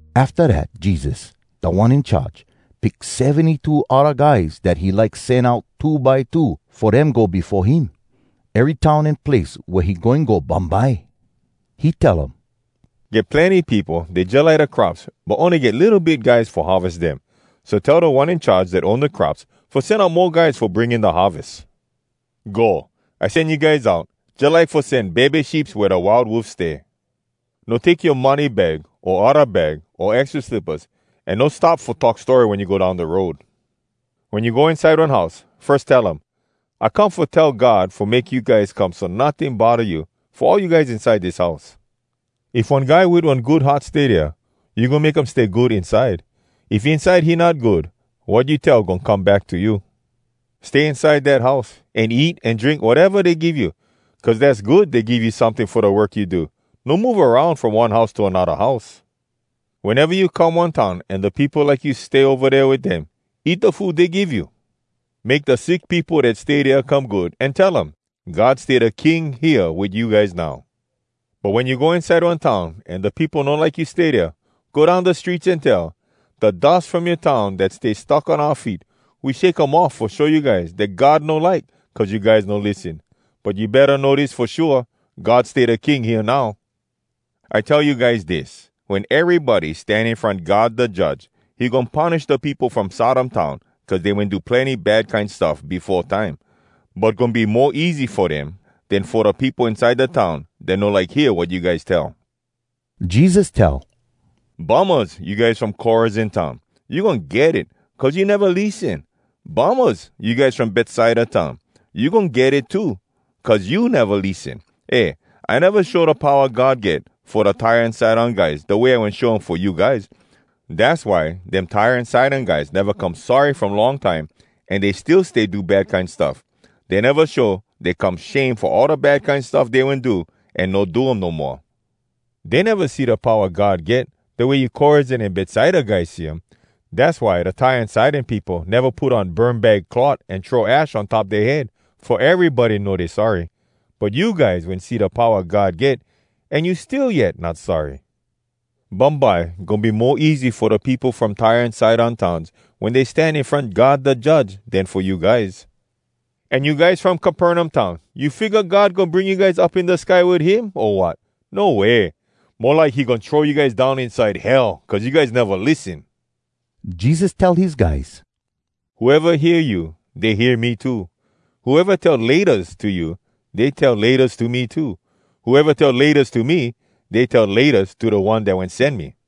Afta dat Jesus, Da One In Charge, pick seventy-two odda guys dat he like sen out two by two, fo dem go befo him, ery town an place wea he goin go bumbye. He tell um, “Get plenny peopo, dey jalike da crops, but ony get litto bit guys fo harves dem. So, tell Da One In Charge dat own da crops fo sen out mo guys fo bring in da harves. Go! I sen you guys out, jalike fo sen bebe sheeps wea da wild wolfs stay. “No take yoa money bag o odda bag o extra slippas, an no stop fo talk story wen you go down da road. Wen you go inside one house, firs tell um, ‘I come fo tell God fo make you guys come so notting bodda you, fo all you guys inside dis house.’ If one guy wit one good heart stay dea, you goin make him stay good inside. If inside he not good, wat you wen tell goin come back to you. Stay inside dat house, an eat an drink wateva dey give you. Cuz dass good dey give you someting fo da work you do. No move aroun from one house to anodda house. “Weneva you come one town an da peopo like you stay ova dea wit dem, eat da food dey give you. Make da sick peopo dat stay dea come good, an tell um, ‘God stay da King hea wit you guys now.’ “But wen you go inside one town an da peopo no like you stay dea, go down da streets an tell, ‘Da dus from yoa town dat stick on oua feet, we shake um off fo show you guys dat God no like, cuz you guys no lissen. But you betta know dis fo shua: God stay da King hea now.’ I tell you guys dis: Wen erybody stan in front God da Judge, he goin punish da peopo from Sodom town cuz dey wen do plenny bad kine stuff befo time. But goin be mo easy fo dem, den fo da peopo inside da town dat no like hear wat you guys tell!” Jesus tell, “Bummahs, you guys from Korazin town! You goin get it, cuz you neva lissen! Bummahs you guys from Betsaida town! You goin get it too, cuz you neva lissen! Eh, I neva show da powa God get fo da Tyre an Sidon guys da way I wen show um fo you guys. Dass why dem Tyre an Sidon guys neva come sorry from long time an dey still stay do bad kine stuff. Dey neva show dey come shame fo all da bad kine stuff dey wen do, an no do um no moa. Dey neva see da powa God get da way you Korazin an Betsaida guys see um. Dass why da Tyre an Sidon peopo neva put on burmbag cloth an throw ash on top dea head, fo erybody know dey sorry. But you guys wen see da powa God get, an you still yet not sorry! Bumbye goin be mo easy fo da peopo from Tyre an Sidon towns wen dey stan in front God da Judge, den fo you guys. An you guys from Capernaum town, you figga God goin bring you up in da sky wit him, o wat? No way! Mo like he goin throw you guys down inside Hell, cuz you guys neva lissen!” Jesus tell his guys, “Whoeva hear you, dey hear me too. Whoeva tell ‘Laytas’ to you, dey tell ‘Laytas’ to me too. Whoeva tell ‘Laytas’ to me, dey tell ‘Laytas’ to da One dat wen sen me.”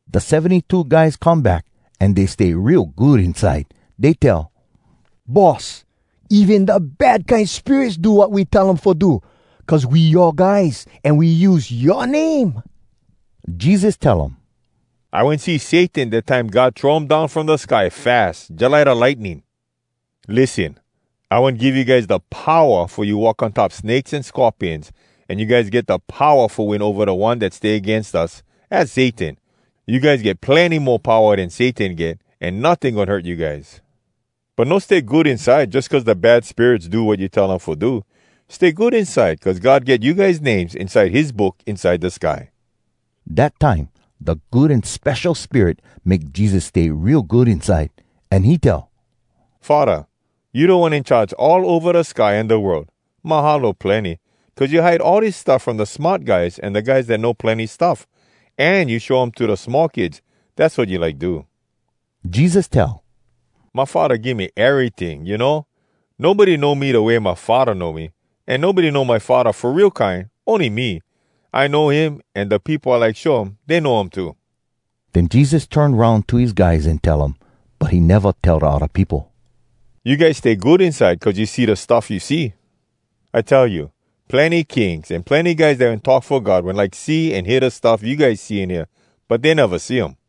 Da seventy-two guys come back, an dey stay real good inside. Dey tell, “Boss, even da bad kine spirits do wat we tell um fo do, cuz we yoa guys, an we use yoa name.” Jesus tell um, “I wen see Satan, dat time God throw um down from da sky fas jalike da lightning. Lissen! I wen give you guys da powa fo you walk on top snakes an scorpions, an you guys get da powa fo win ova da one dat stay agains us, az Satan. You guys get plenny mo powa den Satan get. An notting goin hurt you guys. But no stay good inside jus cuz da bad spirits do wat you tell um fo do. Stay good inside cuz God get you guys names inside his book inside da sky.” Dat time da Good An Spesho Spirit make Jesus stay real good inside. An he tell, “Faddah, you Da One In Charge all ova da sky an da world. Mahalo plenny, cuz you hide all dis stuff from da smart guys an da guys dat know plenny stuff, an you show um to da small kids. Dass wat you like do.” Jesus tell, “My Faddah give me eryting, you know. Nobody know me da way my Faddah know me. An nobody know my Faddah fo real kine, ony me, I know him, an da peopo I like show him, dey know him too.” Den Jesus turn aroun to his guys an tell um (but he neva tell da odda peopo), “You guys stay good inside cuz you see da stuff you see! I tell you, Plenny kings an plenny guys dat wen talk fo God wen like see an hear da stuff you guys see an hear, but dey neva see um.”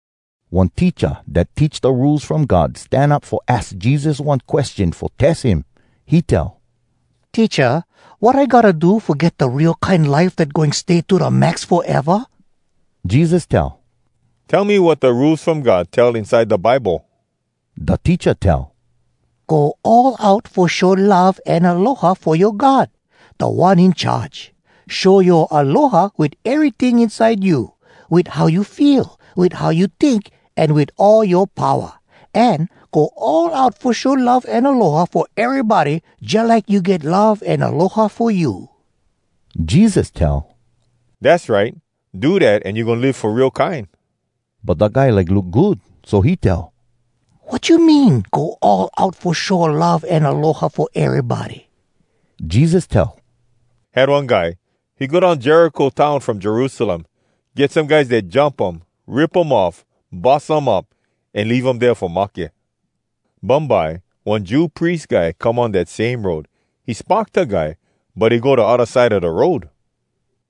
One teacha dat teach da Rules From God stan up fo aks Jesus one question fo tes him. He tell, “Teacha, wat I gotta do fo get da real kine life dat goin stay to da max foeva?” Jesus tell, “Tell me wat da Rules From God tell inside da Bible.” Da teacha tell, “Go all out fo show love an aloha fo yoa God, Da One In Charge. Show yoa aloha wit eryting inside you, wit how you feel, wit how you tink, an wit all yoa powa. An go all out fo show love an aloha fo erybody jalike you get love an aloha fo you.” Jesus tell, “Dass right! Do dat an you goin live fo real kine.” But da guy like look good, so he tell, “Wat you mean, go all out fo show love an aloha fo erybody?” Jesus tell, “Had one guy. He go down Jericho town from Jerusalem. Get some guys dat jump um, rip um off, bus um up, an leave um dea fo mahke. Bumbye one Jew pries guy come on dat same road. He spock da guy, but he go da odda side a da road.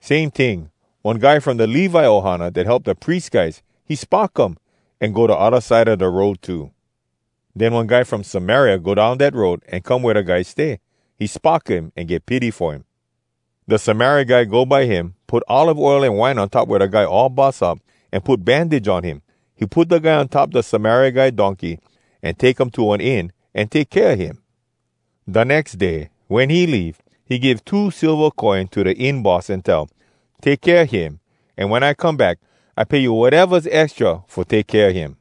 Same ting, one guy from da Levi ohana dat help da pries guys, he spock him, an go da odda side a da road too. Den one guy from Samaria go down dat road an come wea da guy stay. He spock him, an get pity fo him. Da Samaria guy go by him, put olive oil an wine on top wea da guy all bus up, an put bandage on him. He put da guy on top da Samaria guy donkey, an take um to one inn, an take kea him. Da nex day, wen he leave, he give two silva coin to da inn boss an tell, ‘Take kea him, an wen I come back I pay you watevas extra fo take kea him.’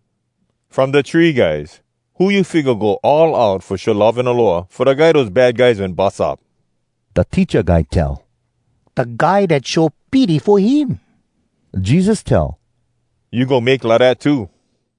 “From da three guys, who you figga go all out fo show love an aloha fo da guy dose bad guys wen bus up?” Da teacha guy tell, “Da guy dat show pity fo him.” Jesus tell, “You go make lidat too!”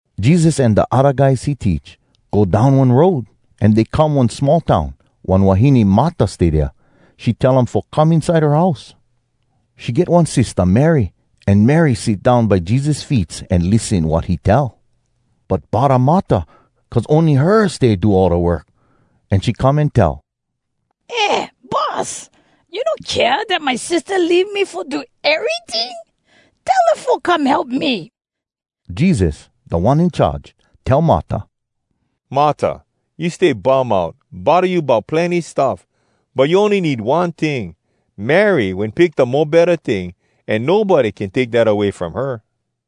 Jesus an da guys he teach go down one road, an dey come one small town. One wahine Marta stay dea. She tell um fo come inside her house. She get one sistah Mary, an Mary sit down by Jesus feets an lissen wat he tell. But bodda Marta cuz ony her stay do all da work, an she come an tell, “Eh Boss, you no kea dat my sistah leave me fo do eryting? Tell her fo come help me!” Jesus, Da One In Charge, tell Marta, “Marta! You stay bum out, bodda you bout plenny stuff! But you ony need one ting. Mary wen pick da mo betta ting, an nobody can take dat away from her.”